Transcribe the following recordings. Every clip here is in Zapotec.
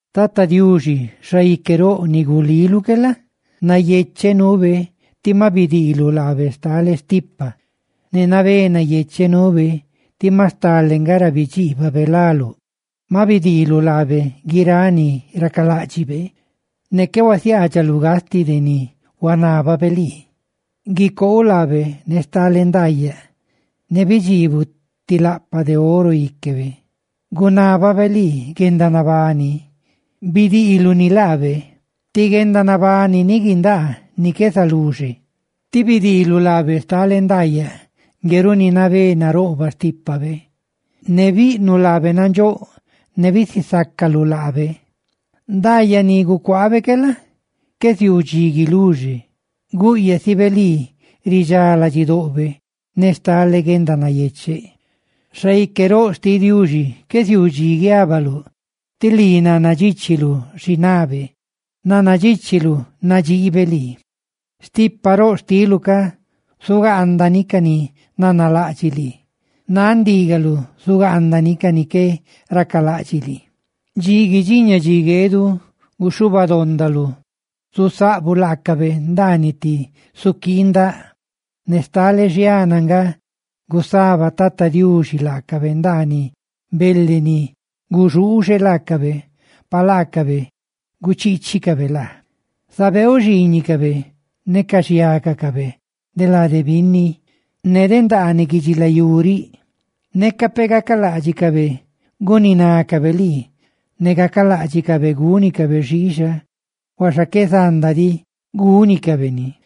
Tata Diuxi, xaique roꞌ ni guliluꞌ que la? nayecheꞌ nuube tí ma bidiiluꞌ laabe stale stipa; ¡ne nabé nayecheꞌ nuube tí ma stale nga ra bidxiibabe láluꞌ! Ma bidiiluꞌ laabe guiráꞌ ni racaláꞌdxibe; ne qué huasiaadxaluꞌ gastiꞌ de ni huanábabe lii. Gucoouꞌ laabe ne stale ndaayaꞌ, ne bidxiibuꞌ ti laꞌpaꞌ oro íquebe. Gunábabe lii guendanabani, bidiiluꞌ ni laabe: ti guendanabani ni guindaa ni qué zaluxe. Tí bidiiluꞌ laabe stale ndaayaꞌ, ngue runi nabé naroꞌbaꞌ xtípabe; ne biꞌnuꞌ laabe nandxóꞌ ne bisisácaluꞌ laabe. Ndaayaꞌ ni gucuaabe que la? qué ziuu dxi guiluxe; gúꞌyaꞌsibe lii ridxá ladxidoꞌbe ne stale guendanayecheꞌ. Xaique roꞌ xtiꞌ Diuxi, qué ziuu dxi guiabalú, tí lii nannadxíchilu xi nabe; ¡nannadxíchiluꞌ nadxiibe lii! Stipaꞌ roꞌ xtiluꞌ cá zugaandani ca ni nanalaꞌdxiꞌ lii; náꞌ ndígaluꞌ zugaandani ca ni qué racalaꞌdxiꞌ lii; dxi guidxiña dxi gueeduꞌ guxhuba dondaluꞌ, zusaꞌbuꞌ laacabe ndaaniꞌ ti suquii ndaꞌ. Ne stale xiana nga gusaba Tata Diuxi laacabe ndaaniꞌ bele ni guxuuxe laacabe, pa laacabe guchiichicabe laa. Zabeeuꞌ xiiñicabe ne ca ni za de laacabe lade binni, ndaaniꞌ guidxilayú riꞌ. Neca peꞌ gacaláꞌdxicabe guninácabe lii ne gacaláꞌdxicabe gúnicabe xiixa, huaxa qué zanda diꞌ gúnicabe ni,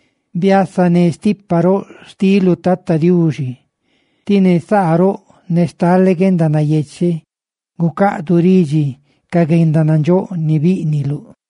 ¡Biasané stipa roꞌ xtiluꞌ, Tata Diuxi! ¡Tí ne ti saa roꞌ ne stale guendanayecheꞌ gucaꞌduꞌ ridxi ca guendanandxóꞌ ni bíꞌniluꞌ!